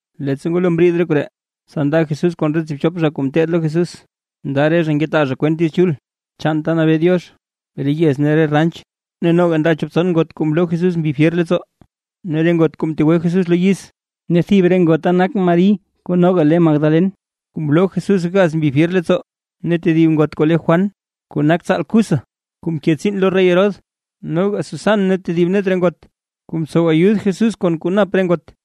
Leettsa ngwalo mriid re koree, tsa nda Jesús kon re tsiibchop zha kuu ngeteed lo Jesús, nda re zha ngetaa zha kwent Diiz Chul chaan ta nabee Diox, re yez ne re ranch. Ne noga nda chop tson ngot kuu mloo Jesús mbi fyer leettsoo, ne re ngot kuu mtegwe Jesús lo yiz. Ne thib re ngota nak Mari kuu noga le Magdalen, kuu mloo Jesús gaz mbi fyer leettsoo, ne tedib ngot kuu le Juan kuu nak tsaal Cuza, kuu mke tsiin lo rey Herodes, noga Susan ne tedib net re ngot kuu mtsow ayud Jesús kon kuu nap re ngot.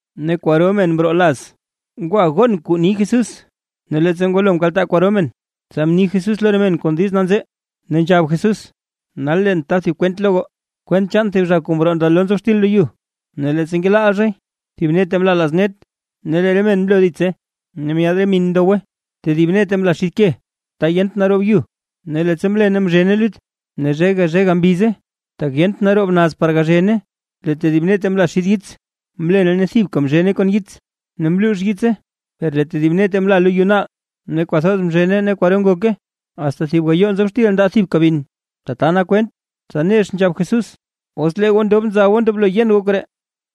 Ne kwaro men mroo laz ngwa gon kuu ni Jesús, ne leettsa ngwalo mkaltaa kwaro men, tsa mni Jesús lo re men kon diiz nanzee, ne nzhab Jesús: ―Nal leen ta thib kwent lo goo, kwent chaan thib zha kuu mroo ndalo nzob xtil lo yu. Ne leettsa ngelaal zhay, thib nete mlaa laaz net, ne lee re men mloo ditse, ne myaad re min ndowe. Tedib nete mlaa xid ke, ta yent naroob yu, ne leettsa mlene mzhene lut, ne zhega zhega mbize, tak yent naroob naz par gazhene. Lee tedib nete mla xid yits, mlene ne thibka mzhene kon yits, ne mluux yitse. Per lee tedib nete mla lo yu naal, ne kwathoz mzhene ne kwaro ngoke, asta thib gayoo nzob xtil mndaa thibka bin. Tata nak kwent. Tsa nex nzhab Jesús: ―¡Os lee goo ndob nza goo ndoblo yen goo koree!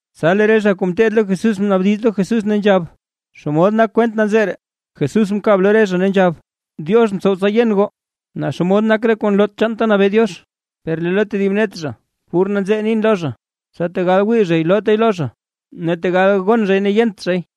Tsa lee re zha kuu ngeteed lo Jesús mnaabdiz lo Jesús, ne nzhab: ―¿Xomod nak kwent nanzee ree? Jesús mkab lo re zha ne nzhab: ―Diox mtsow tsa yen goo naa xomod nak re kuu nloot chaan ta nabee Diox; per lee lo tedib net zha pur nanzee nin lo zha, tsa tegal wii zhay loote lo zha, ne tegal gon zhay yent zhay.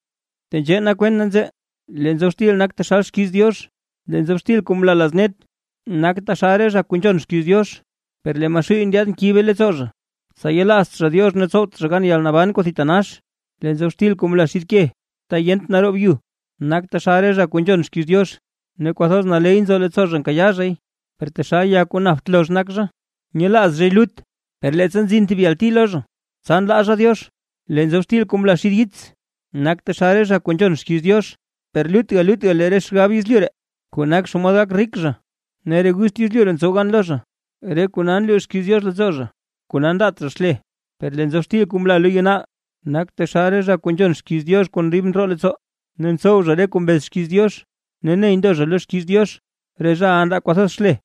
’Tenzhee nak kwent nanzee: Lee nzob xtil nak taxal xkiiz Diox. Lee nzob xtil kuu mla laaz net, nak taxal re zha kuu nzhon xkiiz Diox, per lee Maxuuy nyaad nkibe leettsoo zha, tsa yelaazt zha Diox ne tsowt zha gan yalnaban kuu thitanax. Lee nzob xtil kuu mla xid ke, ta yent naroob yu, nak taxal re zha kuu nzhon xkiiz Diox; ne kwathoz naley nzo leettsoo zha nkayaa zhay, per taxal ya kuu napt lozh nak zha, nyelaaz zhay lut, per leettsa nzin thib yalti lo zha, tsa nlaa zha Diox. Lee nzob xtil kuu mla xid yits, nak taxal re zha kuu nzhon xkiiz Diox, per lutga lutga lee re xgab yezlyu ree, kuu nak xomod gak rik zha, ne re gust yezlyu ree ntsow gan lo zha, re kona nluux xkiiz Diox leettsoo zha, kona ndaat zha xle. Per lee nzob xtil kuu mla lo yu naal, nak taxal re zha kuu nzhon xkiiz Diox kon dib ndroo leettsoo, ne ntsow zha re kuu mbez xkiiz Diox, ne ney ndo zha lo xkiiz Diox, re zhaʼa ndaa kwathoz xle.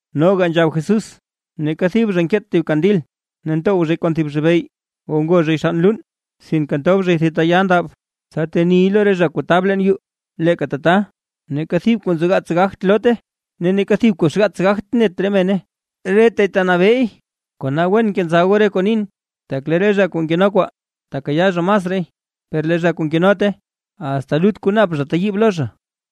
Noga nzhab Jesús: ―Neeka thib zha nkeet thib kandil ne ntow zhay kon thib zhibey o ngo zhay xann luun, sinke ntob zhay thib ta ya ndab, tsa teniy lo re zha kuu tab leen yuu. Leeka tata, neeka thib kuu nzogaats gagt loote, ne neeka thib kuu xgaats gagt net re mene, retay tanabeey. ’Kona wen kenza goo re kuu nin. Tak lee re zha kuu nkeno kwaa, tekayaa zha masraay, per lee re zha kuu nkenote, asta lut kuu nap zha teyiib lo zha.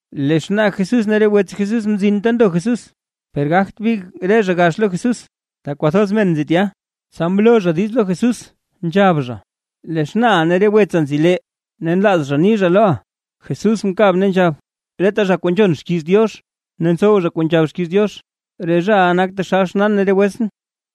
Lee xnaa Jesús ne re wets Jesús mzin ta ndo Jesús, per gagt big re zha gax lo Jesús, tak kwathoz men nzi tya. Tsa mloo zha diiz lo Jesús nzhab zha: ―Lee xnaaʼa ne re wetsa nzi lee, ne nlaaz zha ni zha loʼa. Jesús mkab ne nzhab: ―Reta zha kuu nzhon xkiiz Diox ne ntsow kuu nzhab xkiiz Diox, re zhaʼa nak taxal xnaan ne re wetsʼn.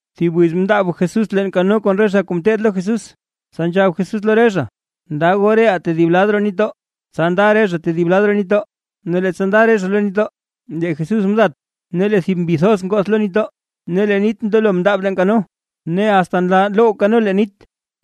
Thib wiz mndaab Jesús leen kano kon re zha kuu ngeteed lo Jesús, tsa nzhab Jesús lo re zha: ―Nda goo reʼaa tedib lad roo nitdoo. Tsa nda re zha tedib lad roo nitdoo. Ne leettsa nda re zha lo nitdoo, lee Jesús mdat. Ne lee thib mbi thoz ngoth lo nitdoo, ne lee nit mndelo mndaab leen kano, ne asta nlaa loww kano leen nit,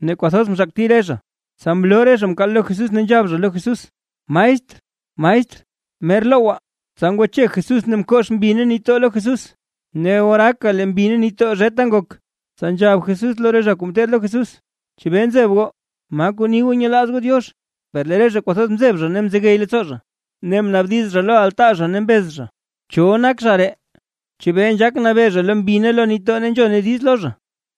ne kwathoz mzhakti re zha. Tsa mloo re zha mkaal lo Jesús, ne nzhab zha lo Jesús: ―¡Maestr! ¡Maestr! ¡Mer lowgwaa! Tsa ngwache Jesús ne mkox mbi ne nitdoo lo Jesús, ne oraaka lee mbi ne nitdoo zheta ngok. Tsa nzhab Jesús lo re zha kuu ngeteed lo Jesús: ―¿Chebee nzeb goo? ¿Ma kuu ni goo nyelaaz goo Diox? Per lee re zha kwathoz mzeb zha ne mzegey leettsoo zha, ne naabdiz zha lo altaa zha ne mbez zha: ―¿Cho nak zha ree, chebee nzhaak nabee zha lo mbi ne lo nitdoo ne nzhone diiz lo zha?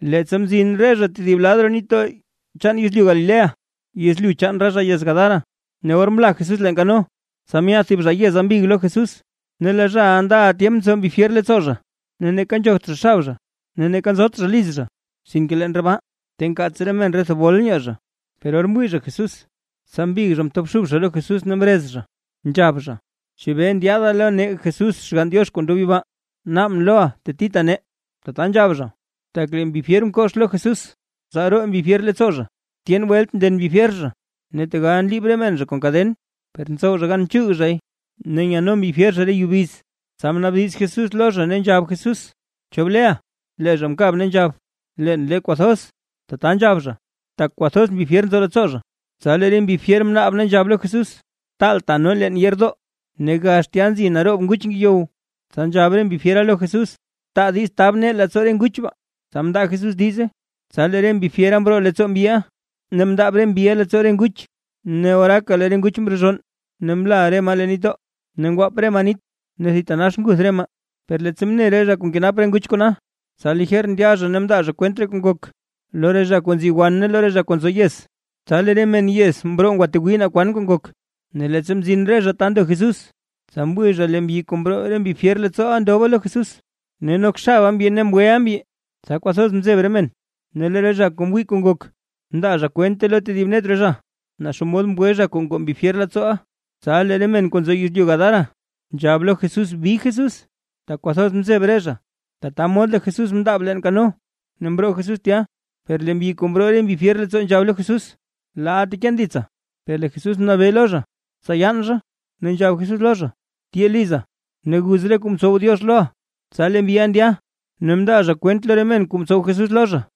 Leettsa mzin re zha tedib lad roo nitdoo chaan yezlyu Galilea, yezlyu chaan re zha yez Gadara. Ne or mla Jesús leen kano, tsa myaad thib zha yeza mbig lo Jesús. Ne lee zhaʼa ndaʼa tyemp nzo mbi fyer leettsoo zha. Ne neeka nzhogt zha xab zha, ne neeka nzot zha liz zha, sinke leen re baa ta nkaats re men re thebol nyoo zha. Per or mwii zha Jesús, tsa mbig zha mtobxub zha lo Jesús ne mrez zha, nzhab zha: ―¿Chebee ndyaada lo nee Jesús Xgann Diox kuu ndob yibaa? ¡Naabʼn loʼa tetita nee! Tata nzhab zha, tak lee mbi fyer mkox lo Jesús tsa roo mbi fyer leettsoo zha. Tyen welt nden mbi fyer zha, ne tegal nliib re men zha kon kaden, per ntsow zha gan nchuug zhay ne nyano mbi fyer zha re yubiz. Tsa mnaabdiz Jesús lo zha, ne nzhab Jesús: ―¿Cho bleʼa? Lee zha mkab, ne nzhab: ―Leen le, kwathoz. Tata nzhab zha, tak kwathoz mbi fyer nzo leettsoo zha. Tsa lee re mbi fyer mnaab ne nzhab lo Jesús: ―Taalta nee leen yeerdoo. Ne gax tya nzi naroob nguch ngeyow, tsa nzhab re mbi fyera lo Jesús: ―Taa diiz tab nee leettsoo re nguch baa. Tsa mndaa Jesús diize. Tsa lee re mbi fyera mroo leettsoo mbyiʼa ne mndaab re mbiʼa leettsoo re nguch. Ne oraaka lee re nguch mrezhonn ne mla re maa leen nitdoo, ngwaap re maa nit ne thitanax nguth re maa. Per leettsa mne re zha kuu nkenap re nguch kona, tsa lijer ndya zha ne mndaa zha kwent kuu ngok, lo re zha kuu nzi wan ne lo re zha kuu nzo yez. Tsa lee re men yez mroo ngwatwii naa kwan kuu ngok. Ne leettsa mzin re zha ta ndo Jesús, tsa mwii zha lee mbyi kuu mroo re mbi fyer leettsooʼa ndoba lo Jesús, ne nok xaba mbyi ne mgweʼa mbyi, tsa kwathoz mzeb re men. Ne lee re zha kuu mwii kuu ngok, mndaa zha kwente lo tedib net re zha, naa xomod mgwe zha kuu ngoo mbi fyer leettsooʼa. Tsa lee re men kuu nzo yezlyu Gadara, nzhab lo Jesús bi Jesús, tak kwathoz mzeb re zha. Tata mod lee Jesús mndaab leen kano ne mroo Jesús tya. Per lee mbyi kuu mroo re mbi fyer leettsoo, nzhab lo Jesús: ―Laaʼa teken ditsa. Per lee Jesús mnabee lo zha, tsa yaan zha, ne nzhab Jesús lo zha: ―Tyee liza, ne guz re kuu mtsow Diox loʼa. Tsa lee mbyiʼa ndya, ne mndaa kwent lo re men kuu mtsow Jesús lo zha.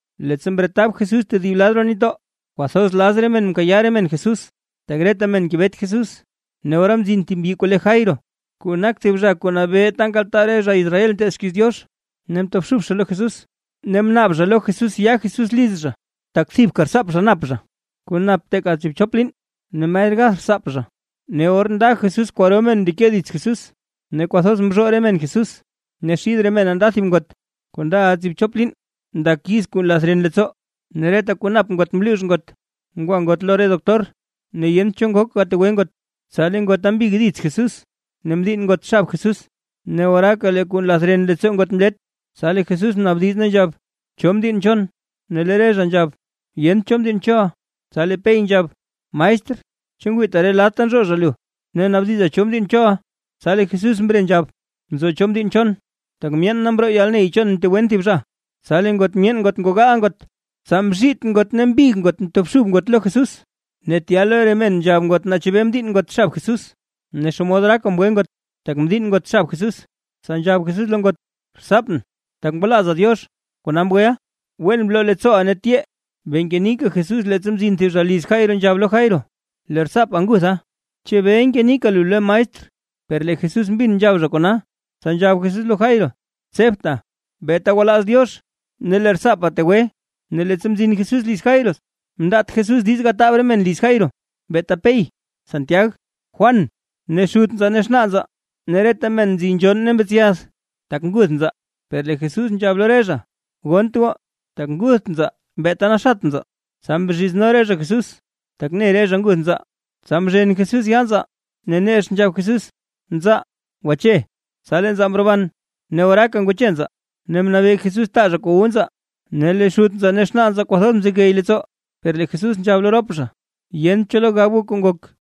Leettsa mretab Jesús tedib lad roo nitdoo, kwathoz laz re men mkayaa re men Jesús, tak reta men ngebet Jesús. Ne ora mzin thib mbyi kuu le Jairo, kuu nak thib zha kuu nabee ta nkaltaa re zha Israel nteed xkiiz Diox, ne mtobxub lo Jesús, ne mnaab zha lo Jesús ya Jesús liz zha, tak thibka rtsaap zha nap zha, kuu nap teeka tsiibchop liin, ne mer gath rtsaap zha. Ne or nda Jesús kwaro men mndeke dits Jesús, ne kwathoz mzhoo re men Jesús. Ne xid re mena nda thib ngot, kuu ndaʼa tsiibchop liin ndak yiz kuu nlath ren leettsoo. Ne reta kuu nap ngot mluux ngot ngwa ngot lo re doctor, ne yent cho ngok gategwe ngot. Tsa lee ngota mbig dits Jesús, ne mdiinn ngot xab Jesús. Ne oraaka lee kuu nlath ren leettsoo ngot mlet. Tsa lee Jesús mnaabdiz, ne nzhab: ―¿Cho mdiinn chon? Ne lee re zha nzhab: ―Yent cho mdiinn choʼa. Tsa lee Pey nzhab: ―Maestr, ¿chu ngwiita reta lad nzhoo zha lu, ne naabdiza, cho mdiinn choʼa? Tsa lee Jesús mre nzhab: ―Nzo cho mdiinn chon, tak myeen na mroo yalney chon mtegwen thib zha. Tsa lee ngot myeen ngot ngogaa ngot, tsa mzhiit ngot ne mbig ngot ne mtobxub ngot lo Jesús. Ne tya lo re men nzhab ngot naa chebee mdiinn ngot xab Jesús, ne xomod oraaka mgwe ngot, tak mdiinn ngot xab Jesús. Tsa nzhab Jesús lo ngot: ―Rtsaapʼn, tak ngwalaaza Diox, kona mgweʼa. Wen bloo leettsooʼa ne tyee. Bee ngenika Jesús leettsa mzin thib zha liz Jairo, nzhab lo Jairo: ―Lee rtsaapa ngutha, chebee ngenika lu lo maestr. Per lee Jesús mbin nzhab zha kona, tsa nzhab Jesús lo Jairo: ―Tsebta; beeta gwalaaz Diox, ne lee rtsaapa tegwe. Ne leettsa mzin Jesús liz Jairo, mndaat Jesús diiz gataab re men liz Jairo, beeta Pey, Santiag, Juan ne xut nzaa ne xnaa nzaa. Ne reta men nzi nzhonn ne mbetsyath tak nguth nzaa, per lee Jesús nzhab lo re zha: ―Gonnt goo, tak ngutht nzaa, beeta naxat nzaa. Tsa mzhizno re zha Jesús, tak ne re zha nguth nzaa. Tsa mzhen Jesús yaa nzaa, ne nex nzhab Jesús: ―¡Nzaa, gwache! Tsa lee nzaa mroban. Ne oraaka ngwache nzaa, ne mnabee Jesús taa zha kuu wu nzaa. Ne lee xut nzaa ne xnaa nzaa kwathoz mzegey leettsoo. Per lee Jesús nzhab lo rop zha, yent cho lo gab zha kuu ngok.